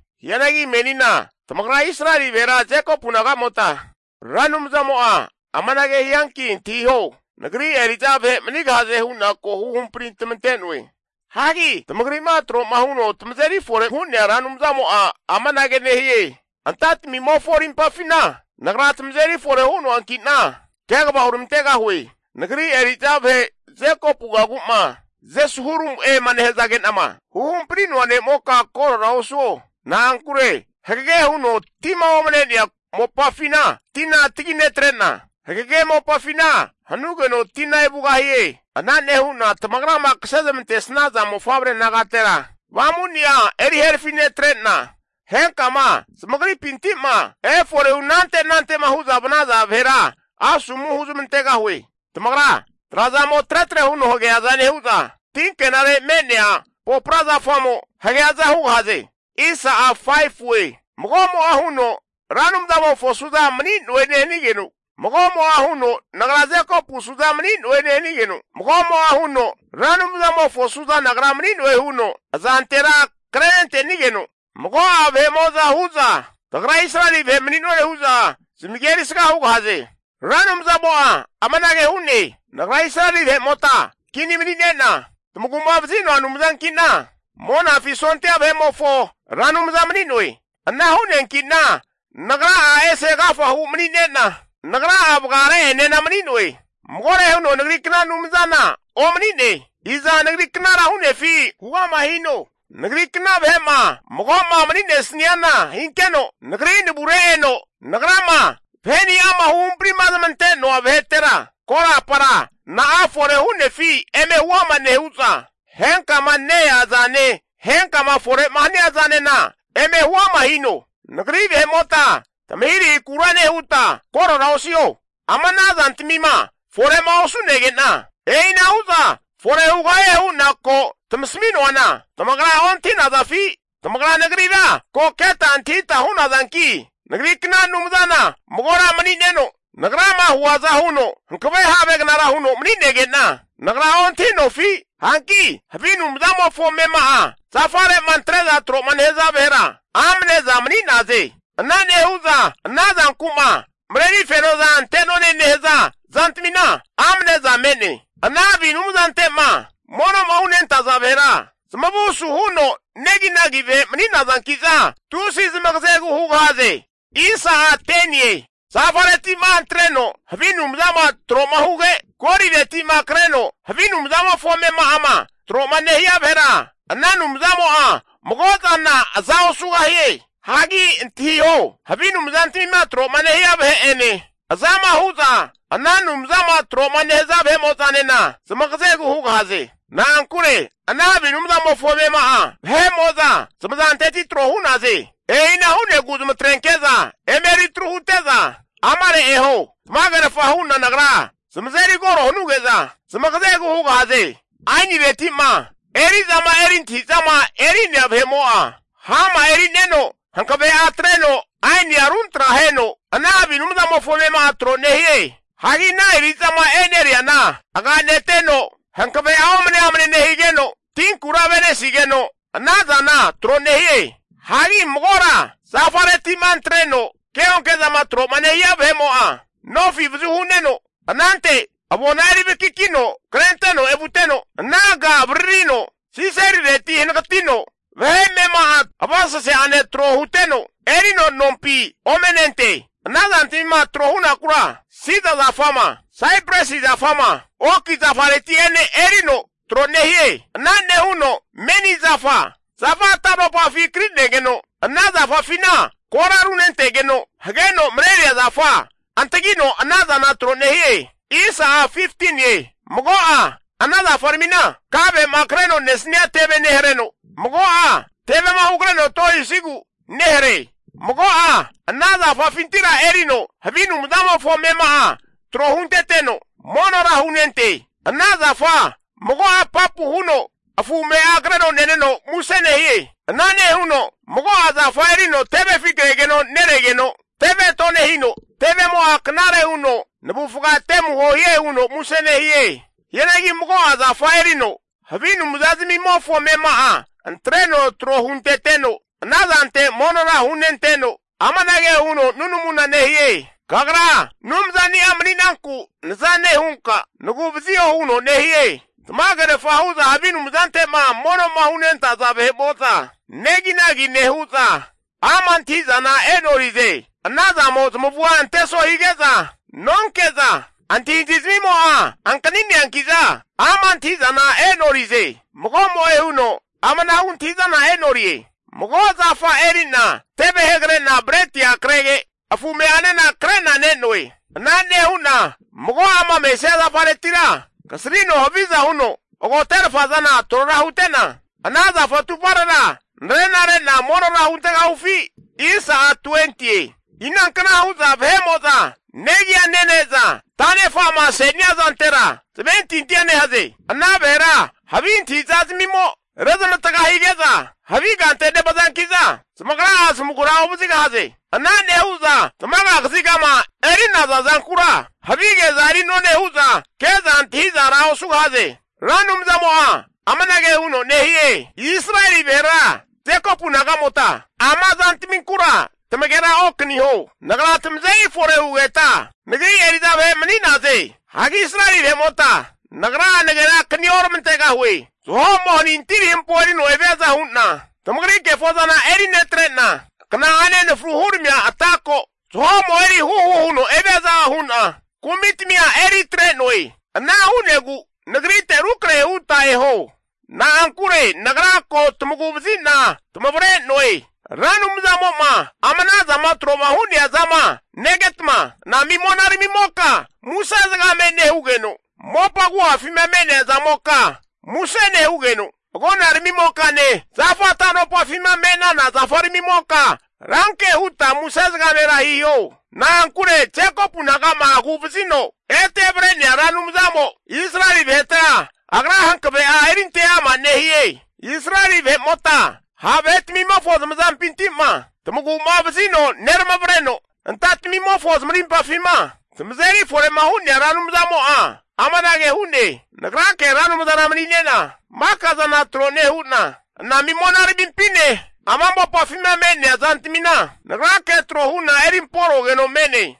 Hianagi menina tamagra Israeli vahera Jekopu naga'mota Ra Anumzamo'a amanage hianki antahiho, Nagri eri'za vahe manigahaze hu'na ko huhampari tamante'noe. Hagi tamagri'ma tro'ma huno tamazeri fore'ma hu'nea Ra Anumzamo'a amanage nehie, antatamimofo rimpafina Nagra tamazeri fore hu'noanki'na, kegava huramantegahue. Nagri eri'za vahe Jekopugagu'ma Jeshurumu'ema nehazage'nama huhampri'noa ne'moka korora osuo. Na'ankure hagege huno tima omane'nea mopafina tina tagi netre'na, hagege mopafina hanugeno tina evugahie. Ana nehu'na tamagrama kase zamantesnaza mofavre nagatera avamuni'a eri herafinetrena henkama zamagripinti'ma efore hunante anante'ma hu'za vanaza vahera asomu huzmantegahue. Zamagra trazamo tretre huno hageaza nehu'za, tinkenare me'nea popra zafamo hageaza hugahaze. Mago'mo'a huno, Ra Anumzamofo suza mani'noe nehanigeno, mago'mo'a huno nagra Jekopu suza mani'noe nehanigeno, mago'mo'a huno Ra Anumzamofo suza nagra mani'noe huno azantera krenentenigeno, mago'a vahe'mo'za hu'za tagra Israeli vahe mani'none hu'za zamagia erisga hugahaze. Ra Anumzamo'a amanage hu'ne, Nagra Israeli vahe'mota kini mani'nena tamagu'ma vazi'noa Anumzankina Monafi sondia vahe'mofo Ra Anumza mani'noe. Ana hu'neankina Nagra'a ese agafa hu mani'nena, Nagra'a vagare'enena mani'noe. Magore huno Nagrikna Anumzana omani'ne. Iza Nagri knara hu'nefi huama hino. Nagrikna vahe'ma mago'ma mani'nesniana hinkeno, nagri navure eno Nagrama vahe'ni'ama huhamprima zamante'noa vahetera korapara na'a fore hu'nefi eme huama nehu'za, henkama ne-ea zane henkama fore'ma hania zanena eme huama hino. Nagri vahe'mota tamahirahikura nehuta korora osiho, ama ana zantamima fore'ma osu'nege'na e'inahuza fore hugahie hu'na ko'ma tamasami'noana tamagra ontahi'nazafi? Tamagra Nagrira ko keta antahita hu'nazanki, nagrikna Anumzana magora mani'neno, Nagrama huaza huno hankave havegnara huno mani'nage'na nagra ontahi'nofi? Hanki havi anumzamofo amema'a zafare'ma antre'za tro'ma nehaza vahera amne'za mani'naze. Ana nehu'za ana zanku'ma mareri fenoza ante'none nehaza zantamina amneza me'ne. Ana havi anumzante'ma mono'ma hunentaza vahera, zamavu suhuno neginagi vahe mani'nazanki'za, tusi zamagazegu hugahaze. Zafareti'ma antreno havi anumzama tro'ma huge, golireti'ma kreno havi anumzamofo amema'ama tro'ma nehia vahera, ana anumzamo'a mago zana aza osugahie. Hagi antahiho, havi anumzantamima troma nehia vahe'ene azama hu'za ana anumzama tro'ma nehaza vahe'mo'zanena zamagazegu hugahaze. Na'ankure ana havi anumzamofo ame'ma'a vahe'mo'za zamazanteti tro hu'naze. E'ina hu'negu zamatrenke'za eme eri atru hute'za amare eho. Tamagerfa hu'na nagra zamazeri koro hanuge'za, zamagazegu hugahaze. Ainireti'ma eri'zama eri antahi'zama eri'nea vahe'mo'a hama eri'neno hankave'a atreno ainia runtra aheno ana havi anumzamofo amema'a tro nehie. Hagi ana eri'zama e'neriana aganegeteno hankave'a omne amne nehigeno, tinkura ave'nesigeno ana zana tro nehie. Hagi magora zafareti'ma antreno keonke zama tro'ma nehia vahe'mo'a, nofi avazu hu'neno, anante avona eri vakakino krenteno evuteno, ananka avaririno siselireti hanagatino vahe amema'a avaseseane tro huteno erino nompi ome nente. Ana zantamima tro hunakura sida zafama, saipresi zafama oki zafareti'ene erino tro nehie. Ana nehuno menizafa, zafa tanopafi krinegeno ana zafafina kora runentegeno hageno mareneria zafa antagino ana zana tro nehie. Mago'a ana zafaramina, kave'ma kreno nesnia teve nehareno, mago'a tevema hugreno tohisigu nehare. Mago'a ana zafafintira erino havi anumzamofo amema'a tro hunteteno, monora hunente. Ana zafa mago'a apapu huno afu ame'a kreno neneno muse nehie. Ana nehuno mago'a zafa erino tevefi kregeno neregeno teve tonehino, tevemo'a knare huno navufga temuho hie huno muse nehie. Hianagi mago'a zafa erino havi anumzazamimofo amema'a antreno tro hunteteno ana zante monora hunenteno, amanage huno nunamuna nehie, kagra anumzani'a mani'nanku naza nehunka nagu'vazio huno nehie. Tamagerfa hu'za havi anumzante'ma mono'ma hunentaza vahe'mo'za neginagi nehu'za, ama antahi'zana e'norize. Anazamo zamavua anteso hige'za nonke'za, antahintahi zamimo'a ankanire'neanki'za ama' antahi'zana e'norize. Mago'mo'e huno amanahu antahi'zana e'norie. Mago zafa eri'na teve hegre'na bretia krege afu ame'anena krena ne'noe. Ana nehu'na mago'ama mesia zafaretira kasrino haviza huno agoterfa zana trora hutena ana zafa atuparera narena re'na monora huntegahufi? Inankna hu'za vahe'mo'za negia nene'za tanefa'ma ase'nia zantera zamentintia nehaze? Ana vahera havi antahi'zazmimo rezamavatga hige'za havi kante nevazankiza, zamagra'a zamagura ovazigahaze. Ana nehu'za tamaga kazigama eri'naza zankura havige'za eri'none hu'za ke'za antahi'zara osugahaze. Ra Anumzamo'a amanage huno nehie, Israeli vahera Jekopu nagamota ama zantaminkura tagera okaniho, nagra tamazeri fore hugeta nagri eri'za vahe mani'naze. Hagi Israeli vahe'mota Nagra nagera akani oramantegahue. Zaho'mo hanintiri hampo erino eviaza hu'na, tamagri kefozana eri netre'na, kna'ane anafru huramia ata ko zahomo eri huhu huno eviaza hu'na kumi tamia eri atre'noe. Ana hu'negu Nagrite rukrahe huta eho, na'ankure nagra ko tamagu'vazina tamavre'noe. Ra Anumzamo'ma ama anazama tro'ma hu'nea zama negetma, anami monaramimoka muse zagame nehugeno, mopa agu'afima me'nea zamoka muse nehugeno, agonaramimokane zafa tanopafima me'nana zafaramimotanena ranke huta muse zagamera hiho. Na'ankure Jekopu naga'ma aguvazino ete avre'nea Ra Anumzamo Israeli vahetera agra hankave'a erinte ama' nehie. Israeli vahe'mota ha' vahetmimofo zamazampinti'ma tamagu'mavazino neramavreno, antatamimofo zamarimpafima tamazeri fore'ma hu'nea Ra Anumzamo'a amanage hu'ne, Nagrake Ra Anumzana mani'nena maka zana tro nehu'na, anami monaramimpine ama mopafima me'nea zantamina nagrake tro hu'na erimporogeno me'ne.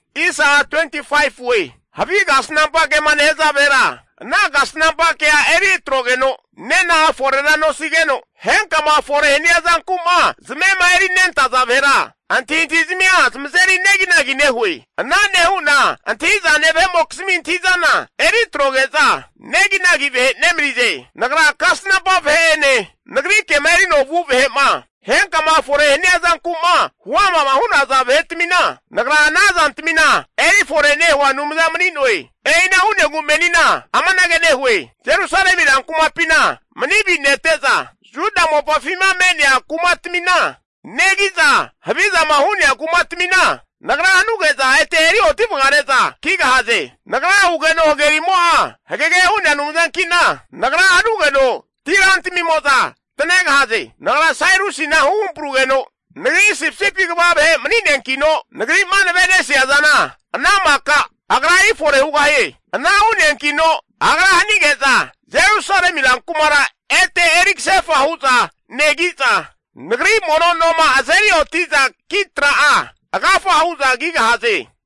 Havi kasnampa kema nehaza vahera ana kasnampa kea eri atrogeno nena'a forera nosigeno, henkama fore hania zanku'ma zamema eri nentaza vahera antahintahi zamia zamazeri neginagi nehue. Ana nehu'na antahi'zane vahe'mokizmi antahi'zana eri atroge'za, neginagi vahe nemanize. Nagri kasnampa vahe'ene, nagri kema erino vu vahe'mo'zama henkama fore hania zanku'ma huama'ma hu'naza zantamina, Nagra ana zantamina erifore nehua Anumza mani'noe. E'ina hu'negu menina amanage nehue, Jerusalemi rankumapina mani avinete'za, Juda mopafima me'nea kumatmina negi'za havizama hu'nea kumatamina nagra hanuge'za ete erioti vagare'za kigahaze. Nagra hugeno hagerimo'a hagege hu'nea Anumzankina, nagra hanugeno tirantamimo'za tanegahaze. Nagra Sairusina huhamparugeno nagri sipisipi kva vahe mani'neankino, Nagri'ma nave'nesia zana ana maka agra eri fore hugahie. Ana hu'neankino agra hanige'za Jerusalemi ran kumara ete eri kasefa hu'za negi'za, Nagri mono noma azeri oti'za ki tra'a agafa hu'za kigahaze.